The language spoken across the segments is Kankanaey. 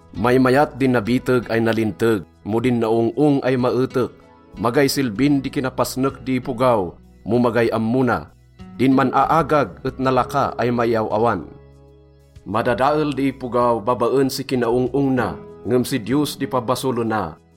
Maymayat di nabiteg ay nalinteg mo din naong-ong ay maetek. Magay silbin di kinapasnek di ipogaw mo magay ammo na. Din man-aagag et nalaka ay maiaw-awan. Madadael di ipogaw babaen si kinaong-ong na, ngem si Diyos di pabasolena.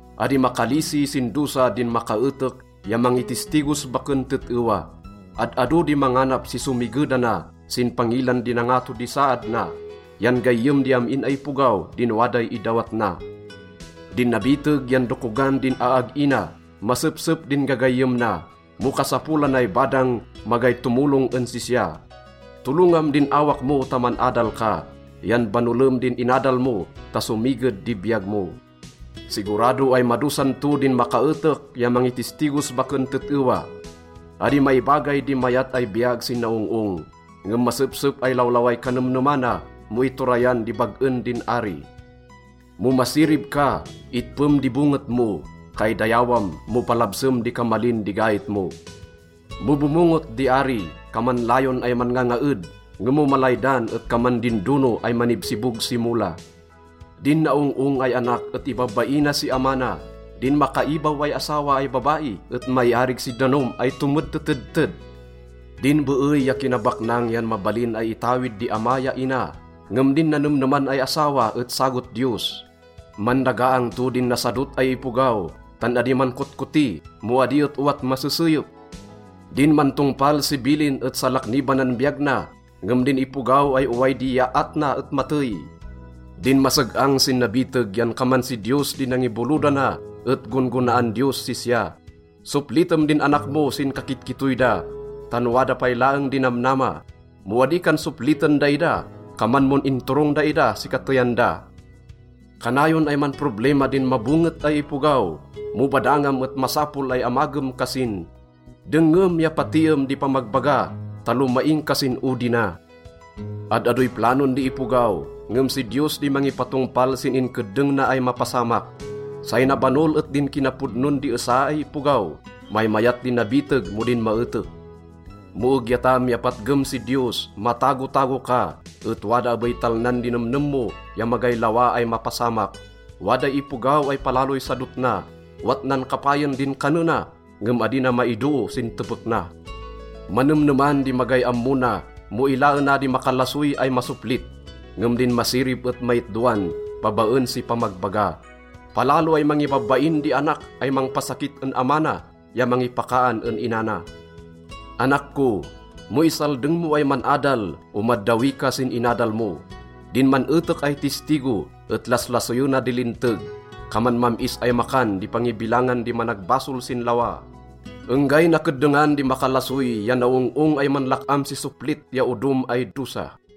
Adi makalisi sin dosa din makaetek ya mangitistigos baken tet-ewa. Ad-ado di manganap si somigedana sin pangilan di nangato di saad na, yan gayyem di am-in ay ipogaw din waday idawat na. Din nabiteg yan dokogan din aag-i na, masepsep din gagayyem na. Mo kasapolanay badang, magay tomolong en sisya. Tolongam din awak mo ta man-adal ka, yan banolem din inadal mo ta somiged di biyag mo. Sigurado ay madosan to din makaetek ya mangitistigos baken tet-ewa. Adi maibagay di mayat ay biyag sin naong-ong, ngem masepsep ay lawlaway kanemnemana mo iturayan di bag-en din ari. Mo masirib ka, itpem di bonget mo. Kaidayawam mo palabsem di kamalin di gait mo. Mo bomonget di ari, kaman layon ay manngangaed, ngem mo malaydan et kaman din dono ay manibsibog si mola. Din naong-ong ay anak et ibabaina si ama na. Din makaibaw ay asawa ay babai et maiarig si danom ay tomedtetedted. Din beey ya kinabaknang yan mabalin ay itawid di ama ya ina, ngem din nanemneman ay asawa et sagot Diyos. Mandagaang to din nasadot ay ipogaw, tan adi mankotkoti mo adi et owat maseseyep. Din mantongpal si bilin et salaknibanan biyag na, ngem din ipogaw ay oway di iyaat na et matey. Din maseg-ang sin nabiteg yan kaman si Diyos di nangibolodana et gon-gonaan Diyos sisya. Soplitem din anak mo sin kakitkittoy da, tan wada pay laeng di namnama. Mo adi kan sopliten daida, kaman mon inturong daida si kateyan da. Kanayon ay manproblima din mabonget ay ipogaw. Mo badangam et masapol ay amagem kasin. Dengngem ya patiem di pamagbaga ta lomaing ka sin odi na. Ad-adoy planon di ipogaw, ngem si Diyos di mangipatongpal sin inkeddeng na ay mapasamak. Say nabanol et din kinapodnon di esa ay ipogaw. Maymayat di nabiteg mo din maetek. Mo egyatam ya patgem si Diyos, matagotago ka, et wada abey talnan di nemnem mo ya magay lawa ay mapasamak. Waday ipogaw ay palaloy sadot na. Owat nan kapayen din kanena, ngem adi na maidoo sin tepek na. Manemneman di magay ammo na mo ilaena di makalasoy ay masoplit, ngem din masirib et maitdoan babaen si pamagbaga. Palalo ay mangibabain di anak ay mangpasakit en ama na ya mangipakaan en ina na. Anak ko, mo isaldeng mo ay man-adal, omaddawi ka sin inadal mo. Din man-etek ay tistigo et laslasoyena di linteg. Kaman mam-is ay makan di pangibilangan di managbasol sin lawa. Enggay nakeddengan di makalasoy ya naong-ong ay manlak-am si soplit ya odom ay dosa.